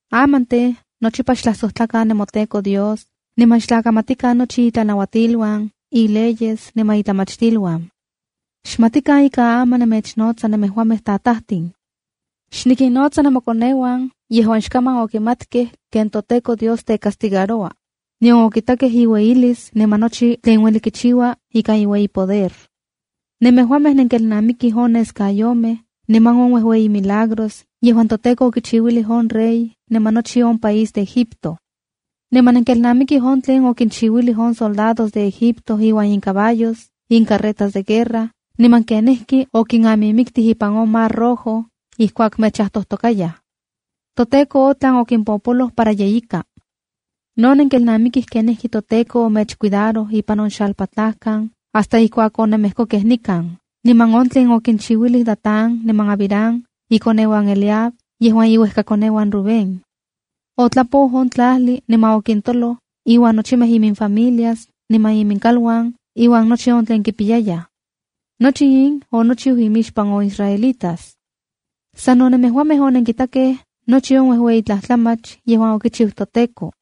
’Aman tej, nochipa xtlajsojtlakan nemoTEKO Dios niman xtlakamatikan nochi itlanauatiluan, ileyes niman itlamachtiluan. Xmatikan ika aman nemechnotsa nemejuamej tajtatin. Xnikinnotsa nemokoneuan yejuan xkaman okimatkej ken toTEKO Dios tecastigaroua, nion okitakej iueyilis niman nochi tlen ueli kichiua ikan iueyi poder. Nemejuamej nenkelnamikij on neskayomej niman on uejueyi milagros yejuan toTEKO okichiuilij on rey niman nochi on país de Egipto. Niman nenkelnamikij on tlen okinchiuilij on soldados de Egipto iuan incaballos, incarretas de guerra, niman kenijki okinamimiktij ipan on Mar Rojo ijkuak mechajtojtokayaj. ToTEKO otlan okimpopoloj para yeyika. No nenkelnamikij kenijki toTEKO omechcuidaroj ipan on xalpatlajkan hasta ijkuak onenmejkokej nikan, niman on tlen okinchiuilij Datán niman Abiram, ikoneuan Eliab, yejuan iuejkakoneuan Rubén. Otlapou on tlajli niman okintoloj iuan nochimej iminfamilias niman iminkaluan iuan nochi on tlen kipiyayaj. Nochi in onochiu imixpan nochimej on israelitas. Sano nemejuamej onenkitakej nochi on uejueyi tlajtlamach yejuan okichiu toTEKO.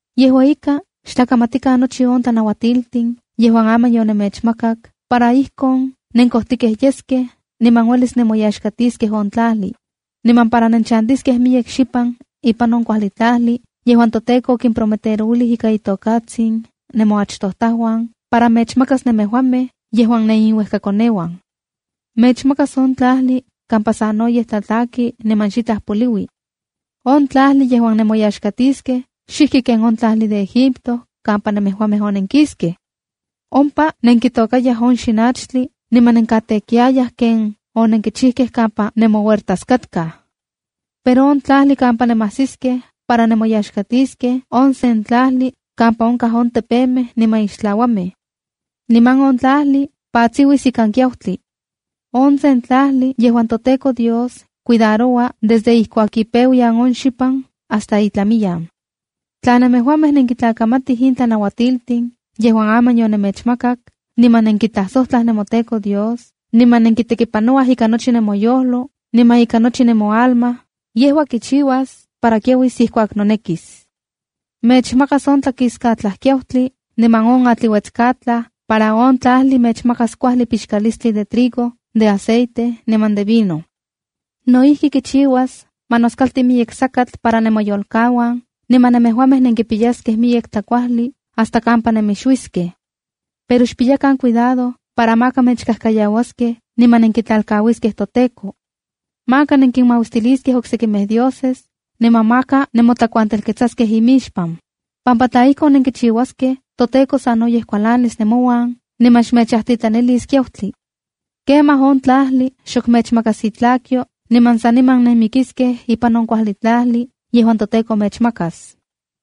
’Yejua ika, xtlakamatikan nochi on tlanauatiltin yejuan aman yonemechmakak para ijkon nenkojtikej yeskej niman uelis nemoyaxkatiskej on tlajli, niman para nenchantiskej miyek xipan ipan on kuajli tlajli yejuan toTEKO okimprometerouilij ika itokatsin nemoachtojtajuan para mechmakas nemejuamej yejuan neniuejkakoneuan. Mechmakas on tlajli kampa sanoyej tlatlaki niman xitlaj poliui. On tlajli yejuan nenkimoyaxkatiskej, xijki ken on tlajli de Egipto kampa nemejuamej onenkiskej. Ompa nenkitôkayaj on xinachtli, niman nenkatekiayaj ken onenkichikej kampa nemohuertas katkaj. Pero on tlajli kampa nemajsiskej para nemoyaxkatiskej, on sen tlajli kampa onkaj on tepemej niman ixtlauamej. Niman on tlajli patsiuis ikan kiautli. On sen tlajli yejuan toTEKO Dios cuidaroua desde ijkuak ipeuyan on xipan hasta itlamiyan. ’Tla nemejuamej nenkintlakamatij in tlanauatiltin yejuan aman yonemechmakak, niman nenkitlajsojtlaj nemoTEKO Dios, niman nenkipanouaj ika nochi nemoyojlo, niman ika nochi nemoalma, yejua kichiuas para kiauis ijkuak nonekis. Mechmakas on tlakiskatlaj kiautli niman on atliuetskatlaj, para on tlajli mechmakas kuajli pixkalistli de trigo, de aceite niman de vino. No ijki, kichiuas ma noskalti miyek sakatl para nemoyolkauan, niman nemejuamej nenkipiyaskej miyek tlakuajli hasta kampa nemixuiskej. Pero xpiyakan cuidado para maka mechkajkayauaskej niman nenkitlalkauiskej toTEKO. Maka nenkinmauistiliskej oksekimej dioses, niman maka nemotlakuantelketsaskej imixpan, pampa tla ijkon nenkichiuaskej, toTEKO sanoyej kualanis nemouan niman xmechajtitlanilis kiautli. Kemaj on tlajli xok mechmakas itlakyo, niman saniman nenmikiskej ipan on kuajli tlajli yejuan toTEKO mechmakas.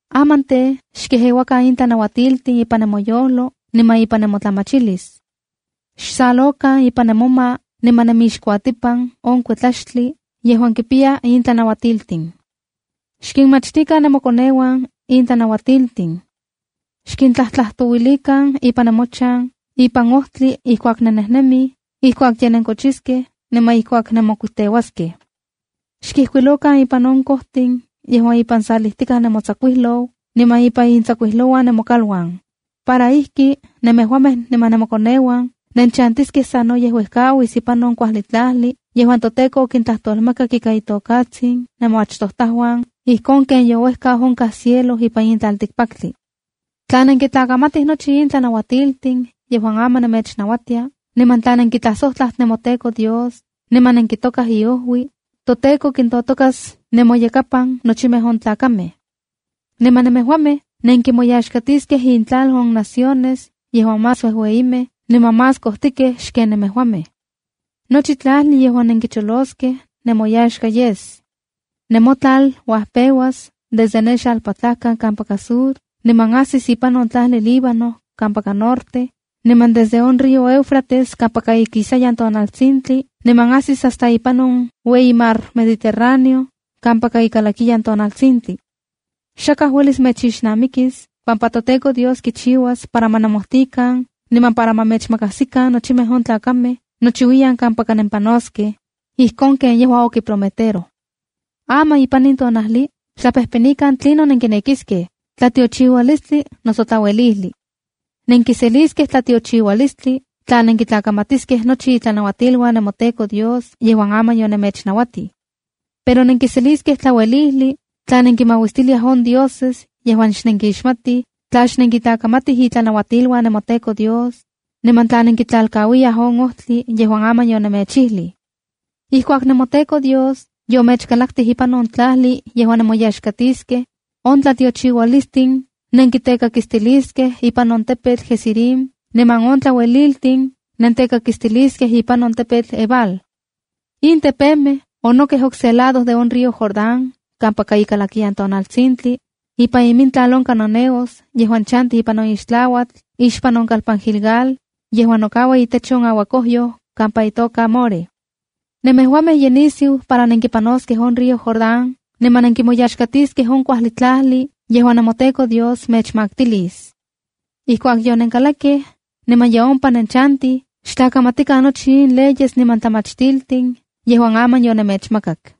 ’Aman tej, xkejeuakan in tlanauatiltin ipan nemoyojlo niman ipan nemotlamachilis. Xsalokan ipan nemoma niman nenmixkuatipan on kuetlaxtli, yejuan kimpiya in tlanauatiltin. Xkinmachtikan nemokoneuan in tlanauatiltin. Xkintlajtlajtouilikan ipan nemochan, ipan ojtli ijkuak nennejnemij, ijkuak ye nenkochiskej, niman ijkuak nenmokuiteuaskej. Xkijkuilokan ipan on kojtin yejuan ipan salijtikaj nemotsakuijlou, niman ipan intsakuijlouan nemokaluan, para ijki nemejuamej niman nemokoneuan nenchantiskej sanoyej uejkauis ipan on kuajli tlajli yejuan toTEKO okintlajtolmakak ika itokatsin nemoachtojtajuan, ijkon ken youejkau onkaj cielo ipan in tlaltikpaktli. ’Tla nenkintlakamatij nochi in tlanauatiltin yejuan aman nemechnauatia, niman tla nenkitlajsojtlaj nemoTEKO Dios niman nenkitokaj iojui, toTEKO kintotokas nemoyakapan nochimej on tlakamej. Niman nemejuamej nenkimoyaxkatiskej intlal on naciones yejuan más uejueyimej niman más kojtikej xken nemejuamej. Nochi tlajli yejuan nenkicholoskej nemoyaxka yes. Nemotlal uajpeuas desde ne xalpatlajkan kampaka sur, niman ajsis ipan on tlajli Líbano kampaka norte, niman desde on río Éufrates kampaka ikisayan tonaltsintli niman ajsis hasta on ueyi Mar Mediterraneo kampaka ikalakiyan tonaltsintli. Xakaj uelis mechixnamikis, pampa toTEKO Dios kichiuas para ma nomojtikan, niman para ma mechmakajsikan nochimej on tlakamej nochiuiyan kampaka nempanoskej, ijkon ken yejua okiprometeroj. ’Aman ipan in tonajli xtlapejpenikan tlinon nenkinekiskej, tlatiochiualistli noso tlauelijli. Nenkiseliskej tlatiochiualistli tla nenkitlakamatiskej nochi itlanauatiluan nemoTEKO Dios yejuan aman yonemechnauatij. Pero nenkiseliskej tlauelijli, tla nenkinmauistiliaj on dioses yejuan xnenkimixmatij, tla xnenkitlakamatij itlanauatiluan nemoTEKO Dios, niman tla nenkitlalkauiyaj on ojtli yejuan aman yonemechijlij. ’Ijkuak nemoTEKO Dios yomechkalaktij ipan on tlajli yejuan nemoyaxkatiskej, on tlatiochiualistin nentekakistiliskej ipan on tepetl Gerizim niman on tlaueliltin nentekakistiliskej ipan on tepetl Ebal. In tepemej onokej okse lado de on río Jordán kampaka ikalakiyan tonaltsintli, ipan imintlal on cananeos yejuan chantij ipan on ixtlauatl ixpan on kalpan Gilgal, yejuan nokaua itech on auakojyoj kampa itoka More. Nemejuamej ye nisiu para nenkipanoskej on río Jordán niman nenkimoyaxkatiskej on kuajli tlajli yejuan nemoTEKO Dios mechmaktilis. Ijkuak yonenkalakkej niman ye ompa nenchantij, xtlakamatikan nochi in leyes niman tlamachtiltin yejuan aman yonemechmakak.